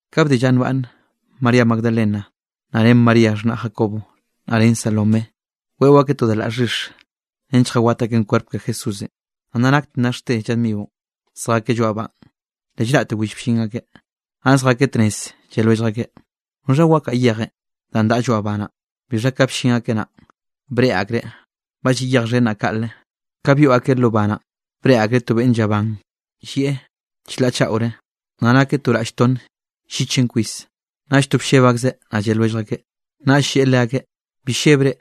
Ka bde lla nbaꞌnne María Magdalena naꞌ ren María xhnaꞌ Jacobo naꞌ ren Salomé, weꞌo akeꞌ da laꞌ xhix nench lljawat akeꞌn kwerp ke Jesúsenꞌ. Naꞌ nna nakte nnaxte lla dmionꞌ zjakeꞌ lloaꞌ banꞌ, le llraꞌte will bllin akeꞌ. Naꞌ zjakeꞌ tnez lle lwellj akeꞌ: —¿Noxha wakaꞌa yejenꞌ danꞌ daꞌa lloaꞌ ba naꞌn? Bixha ka bllin akeꞌ naꞌn, breꞌe akreꞌ ba lliꞌ yej xhen naꞌ kaꞌle. Ka byoꞌ akeꞌ lo ba naꞌn, breꞌe akreꞌ to beꞌnn llaban llieꞌ chlaꞌ chaꞌore, naꞌ nakeꞌ to raꞌll tonne llichenꞌ kwis, naꞌll to blleb akzeꞌ. Naꞌll lleꞌe leakeꞌ: —Bi llebre,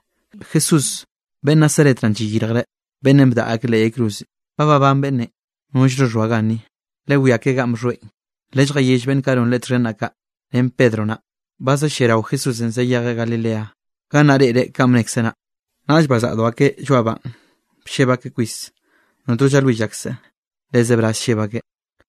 Jesús beꞌnn Nazaret naꞌn llayirjre, beꞌnnenꞌ bdaꞌa akeꞌ leꞌ yay cruzenꞌ. Ba babán beꞌnnenꞌ, nollno xhoa ganni, lewiá ke ganꞌ bxhoeꞌn. Lelljayell beꞌnn kaꞌ non Leꞌe txhen naꞌ kaꞌ, ren Pedro naꞌ, ba za lliarao Jesúsenꞌ zayejeꞌ Galilea, gannaꞌ reꞌreꞌ kanꞌ bnekzeꞌ naꞌ. Naꞌll bazaꞌdo akeꞌ lloaꞌ banꞌ blleb akeꞌ kwis, notno llalwill akseꞌ le zebraz lleb akeꞌ.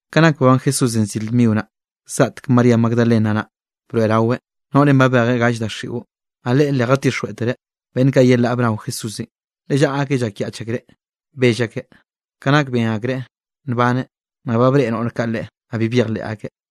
Ka nak babán Jesúsenꞌ zir dmio naꞌ, zgaꞌtek María Magdalena naꞌ, broeꞌraweꞌ, noꞌrenꞌ babejeꞌ gall daxiꞌo. Naꞌ leꞌe le jatixjweꞌtereꞌ beꞌnn kaꞌ yelaꞌ bnao Jesúsenꞌ, le llaꞌa akeꞌ llakyaꞌch akreꞌ bell akeꞌ. Ka nak ben akreꞌ nbaneꞌ, naꞌ ba breꞌe noꞌr kaꞌ Leꞌe, naꞌ bi byejleꞌ akeꞌ.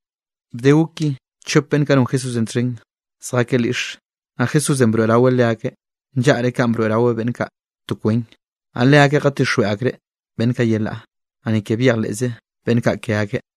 Bde gok ki, chop beꞌnn kaꞌ non Jesúsenꞌ txhen zjakeꞌ lyiꞌxe, naꞌ Jesúsenꞌ broeꞌraweꞌ leakeꞌ, nllaꞌre kanꞌ broeꞌraweꞌ beꞌnn kaꞌ to kwen. Naꞌ leakeꞌ jatixjweꞌ akreꞌ beꞌnn kaꞌ yelaꞌ, naꞌ ni ke byejleꞌze beꞌnn kaꞌ ke akeꞌ.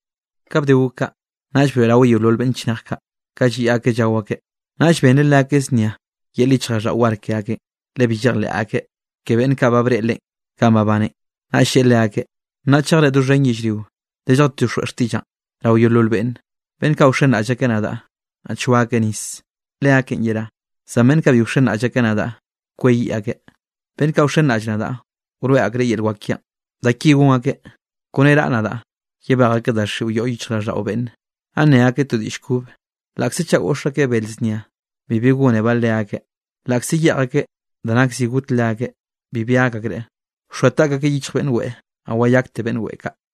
Ka bde gok kaꞌ, naꞌll broeꞌraweꞌ yeolol beꞌnn chnej kaꞌ, ka lliꞌ akeꞌ llao akeꞌ. Naꞌll benreꞌ leakeꞌ znia yel yichjraꞌlldaꞌo war ke akeꞌn, le bi llejleꞌ akeꞌ ke beꞌnn kaꞌ breꞌe Leꞌen kanꞌ babaneꞌn. Naꞌll lleꞌe leakeꞌ: —Nnaꞌ chejre doxhen yellrio lelljatixjweꞌ xtiꞌllaꞌn rao yeolol beꞌnne. Beꞌnn kaꞌ wxenraꞌll akeꞌ nadaꞌ, naꞌ choa akeꞌ nis, leakeꞌn yerá. Zan beꞌnn kaꞌ bi wxenraꞌll akeꞌ nadaꞌ kweyiꞌ akeꞌ. Beꞌnn kaꞌ wxenraꞌll nadaꞌ, wroeꞌ akreꞌ yel wak kiaꞌn, da ki gon akeꞌ: kone raꞌa nadaꞌ, yebej akeꞌ daxiꞌo yoꞌ yichjraꞌlldaꞌo beꞌnne, naꞌ nne akeꞌ to diꞌll kobe. Laꞌkze chaꞌ goꞌx akeꞌ bel znia, bibi gónebaꞌ leakeꞌ, laꞌkze yeꞌj akeꞌ da nak zi got leakeꞌ, bibi gak akreꞌ, wxoa taꞌk akeꞌ yichj beꞌnn weꞌe, naꞌ wayakte beꞌnn weꞌe kaꞌ.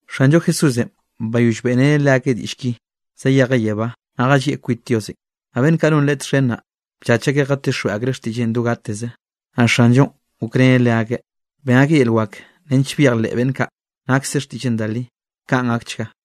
Xanllo Jesúsenꞌ, bayoll beꞌreneꞌ leakeꞌ diꞌll ki, zayejeꞌ yebá, naꞌ jallieꞌ kwit Diosenꞌ. Naꞌ beꞌnn kaꞌ non Leꞌe txhen naꞌ, bllach akeꞌ jatixjweꞌ akreꞌ xtiꞌlleꞌn do gateze. Naꞌ Xanllonꞌ gokreneꞌ leakeꞌ, ben akeꞌ yel wak nench byejleꞌ beꞌnn kaꞌ nakse xtiꞌlleꞌn da li. Kaꞌn gakchga.